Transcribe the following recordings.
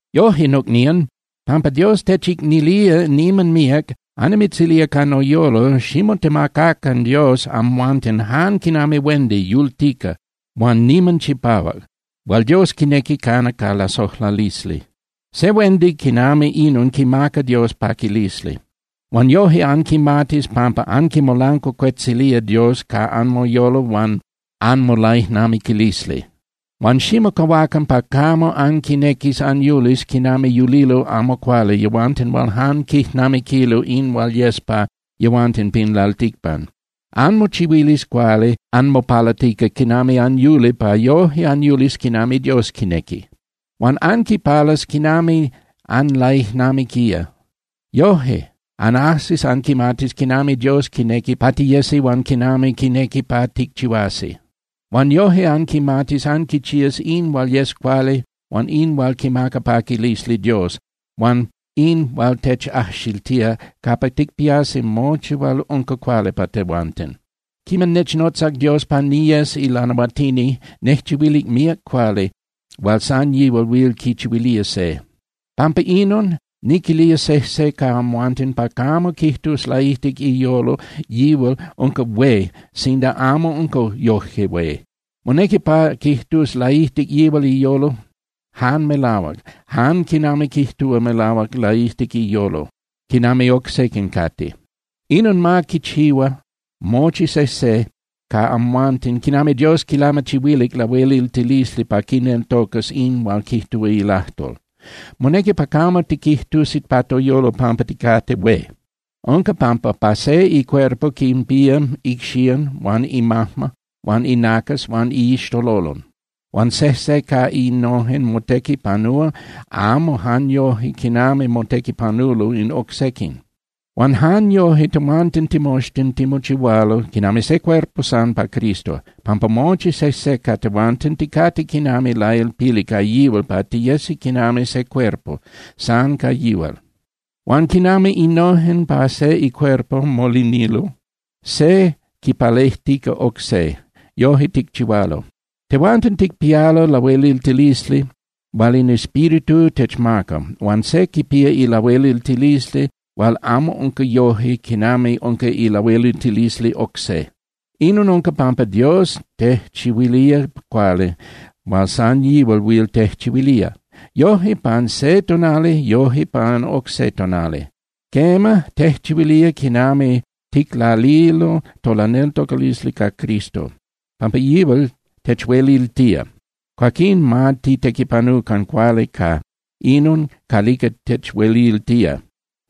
Yoje, nocnían, pampa Dios techicnilía niman míac, annimitzilía ca noyolo, ximotemacacan Dios amhuanten jan quinami huendi yultica huan niman chipahuac, hual Dios quinequi cana ca lasojlalisli. Se huendi quinami inon quimaca Dios paquilisli. Huan yoje anquimatis pampa anquimolancuacuetzilía Dios ca anmoyolo huan anmolaijnamiquilisli. Huan ximocahuacan pa camo anquinequis anyulis quinami yulilo amo cuali yehuanten hual jan quijnamiquilo in hual yes pa yehuanten pin lalticpan. Anmochihuilis cuali anmopalatica quinami anyuli pa yoje anyulis quinami Dios quinequi. Huan anquipalas quinami anlaijnamiquía. Yoje anajsis anquimatis quinami Dios quinequi pa tiyesi huan quinami quinequi pa ticchihuasi. Huan yoje anquimatis anquichías in hual yes cuali huan in hual quimaca paquilisli Dios huan in hual techajxiltía capa ticpiasi mochi hual unca cuali pa tehuanten. Quiman nechnotzac Dios pa niyes ilanahuatini, nejchihuilic míac cuali hual san yihual huil quichihuilía se. Pampa inon, niquilía sejse ca amhuanten pa camo quijtus laijtic iyolo yihual unca hué sinda amo unca yoje hué. Monequi pa quijtus laijtic yihual iyolo jan melahuac, jan quinami quijtúa melahuac laijtic iyolo quinami oc sequin cate. Inon ma quichihua mochi sejse ca amhuanten quinami Dios quilamachihuilic lahueliltilisli pa quineltocas in hual quijtúa ilajtol. Monequi pa camo tiquijtusi pa toyolo pampa ticate hué. Unca pampa pa se icuerpo quinpía icxían huan imajma huan inacas huan iixtololon, huan sejse ca innojen motequipanúa amo jan yoje quinami motequipanulo in oc sequin. Huan jan yoje tehuanten timoxtin timochihualo quinami se cuerpo san pa Cristo, pampa mochi sejse ca tehuanten ticate quinami lailpili ca yihual pa tiyesi quinami se cuerpo san ca yihual. Huan quinami innojen pa se icuerpo molinilo, se quipalejtica oc se, yoje ticchihualo. Tehuanten ticpialo lahueliltilisli hual in Espíritu techmaca, huan se quipía ilahueliltilisli hual amo unca yoje quinami unca ilahueliltilisli oc se. Inon unca pampa Dios tejchihuilía cuali hual san yihual huil tejchihuilía, yoje pan se tonali, yoje pan oc se tonali. Quema, tejchihuilía quiman ticlalilo tolaneltocalisli ca Cristo. Pampa yihual techueliltía, cuaquín ma titequipanucan cuali ca inon calica techueliltía.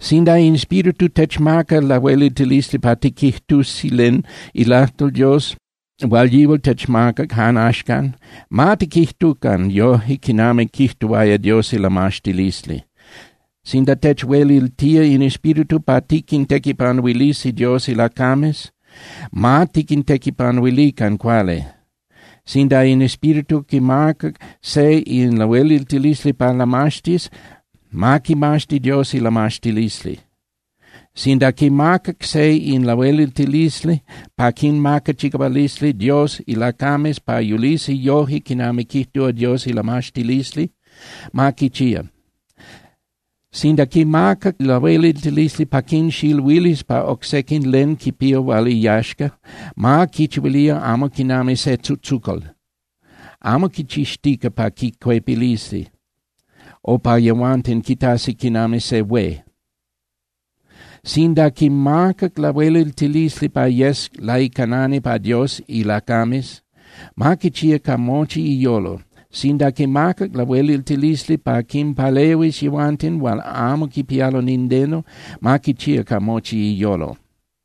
Sinda in Espíritu techmacac lahueliltilisli pa tiquijtusi len ilajtol Dios hual yihual techmacac jan axcan, ma tiquijtucan yoje quinami quijtuaya Dios ilamaxtilisli. Sinda techueliltía in Espíritu pa tiquintequipanuilisi Dios ilacames, ma tiquintequipanuilican cuali. Sinda in Espíritu quimacac se in lahueliltilisli pa lamaxtis, ma quimaxti Dios ilamaxtilisli. Sinda quimacac se in lahueliltilisli pa quinmaca chicahualisli Dios ilacames pa yulisi yoje quinami quijtúa Dios ilamaxtilisli, ma quichía. Sinda quimacac lahueliltilisli pa quinxiluilis pa oc sequin len quipía hual iyaxca, ma quinchihuili amo quinami se tzutzucal, amo quichixtica pa quicuepilisi o pa yehuanten quitasi quinami se hué. Sinda quimacac lahueliltilisli pa yes laicanani pa Dios ilacames, ma quichía ca mochi iyolo. Sinda quimacac lahueliltilisli pa quinpalehuis yehuanten hual amo quipialo nindeno, ma quichía ca mochi iyolo.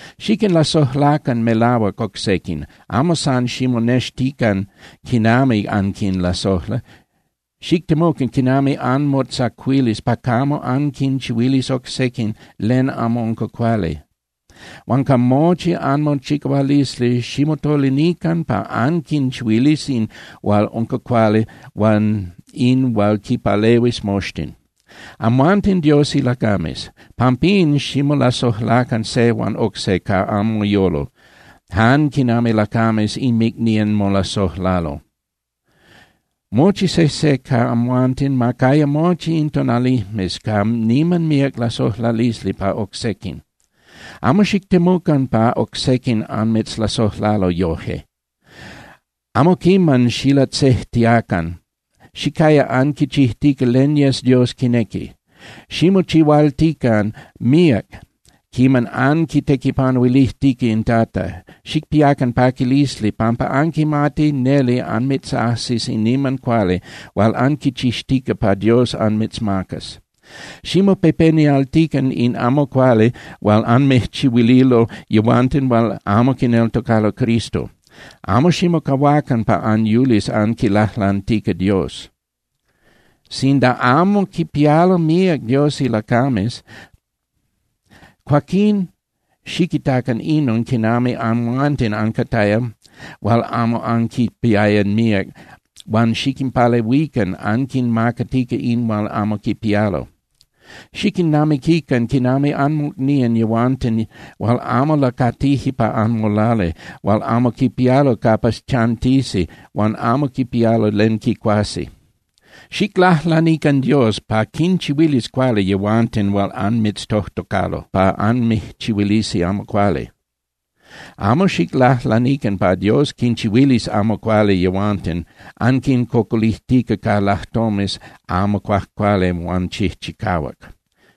Xiquinlasojlacan melahuac oc sequin, amo san ximonextican quinami anquinlasojla. Xictemucan quinami anmotzacuilis pa camo anquinchihuilis oc sequin len amo unca cuali. Huan ca mochi anmochicahualisli, ximotolinican pa anquinchihuilis in hual unca cuali huan in hual quinpalehuis moxtin. Amhuanten Dios ilacames. Pampín ximolasojlacan se huan oc se ca anmoyolo, jan quinami lacames inmicnían molasojlalo. Mochi sejse ca amhuanten ma caya mochi in tonalijmes ca niman míac lasojlalisli pa oc sequin. Amo xictemucan pa oc sequin anmitzlasojlalo yoje. Amo quiman xilatzejtiacan. Xicaya anquichijtica len yes Dios quinequi. Ximochihualtican míac quiman anquitequipanuilijtica in Tata. Xicpiacan paquilisli pampa anquimati neli anmitzajsis in niman cuali hual anquichixtica pa Dios anmitzmacas. Ximopepenialtican in amo cuali hual anmijchihuililo yehuanten hual amo quineltocalo Cristo. Amo ximocahuacan pa anyulis anquilajlantica Dios. Sinda amo quipialo míac Dios ilacames, cuaquín xiquitacan inon quinami amhuanten ancataya hual amo anquipiaya míac huan xiquinpalehuican anquinmacatica in hual amo quipialo. Xiquinnamiquican quinami anmocnían yehuanten hual amo lacatije pa anmolali hual amo quipialo capa chantisi huan amo quipialo len quicuasi. Xiclajlanican Dios pa quinchihuilis cuali yehuanten hual anmitztojtocalo pa anmijchihuilisi amo cuali. Amo xiclajlanican pa Dios quinchihuilis amo cuali yehuanten, anquincocolijtica ca lajtomes amo cuajcuali huan chijchicahuac.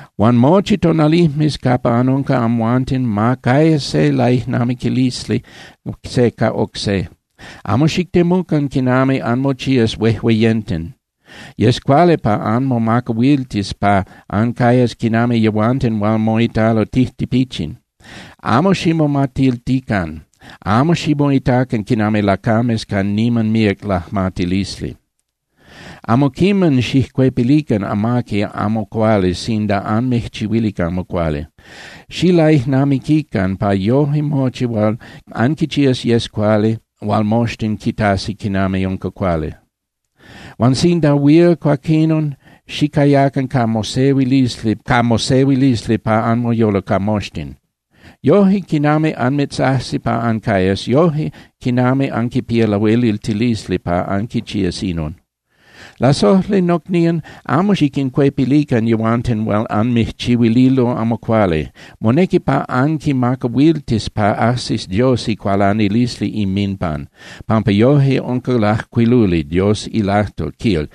Huan mochi tonalijmes capa anunca amhuanten ma caya se laijnamiquilisli se ca oc se. Amo xictemucan quinami anmochías huejueyenten. Yes cuali pa anmomacahuiltis pa ancayas quinami yehuanten hual moitalo tijtipichin. Amo ximomatiltican, amo ximoitacan quinami lacames ca niman míac lajmatilisli. Amo quiman xijcuepilican amaqui amo cuali sinda anmijchihuilic amo cuali. Xilaijnamiquican pa yoje mochi hual anquichías yes cuali hual moxtin quitasi quinami unca cuali. Huan sinda huil, cuaquinon xicayacan ca mosehuilisli pa anmoyolo ca moxtin, yoje quinami anmitzajsi pa ancayas, yoje quinami anquipía lahueliltilisli pa anquichías inon. Lasojli nocnían, amo xiquincuepilican yehuanten hual anmijchihuililo amo cuali. Monequi pa anquimacahuiltis pa ajsis Dios icualanilisli inminpan, pampa yoje unca lajcuiluli Dios ilajtol, quil: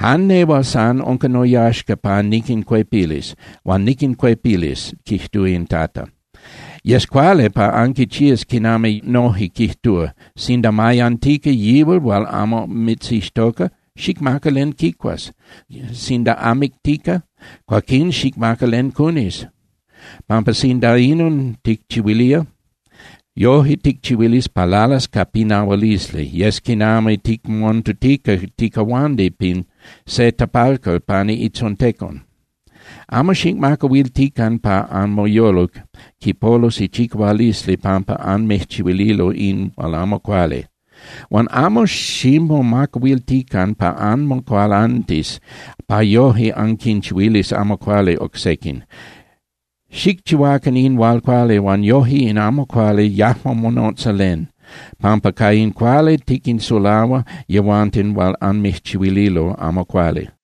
“Jan nehual san unca noyaxca pa niquincuepilis, huan niquincuepilis, quijtúa in Tata.” Yes cuali pa anquichías quinami noje quijtúa: “Sinda mayantica yihual hual amo mitzixtoca, xicmaca len quicuas. Sinda amictica, cuaquín xicmaca len cunis, pampa sinda inon ticchihuilía, yoje ticchihuilis pa lalas ca pinahualisli, yes quinami ticmontutica ticahuandi pin se tapalcal pani itzontecon.” Amo xicmacahuiltican pa anmoyolo quipolus ichicahualisli pampa anmijchihuililo in hual amo cuali, huan amo ximomacahuiltican pa anmocualantis pa yoje anquinchihuilis amo cuali oc sequin. Xicchihuacan in hual cuali, huan yoje in amo cuali yajmo monotza len, pampa ca in cuali tiquinsulahua yehuanten hual anmijchihuililo amo cuali.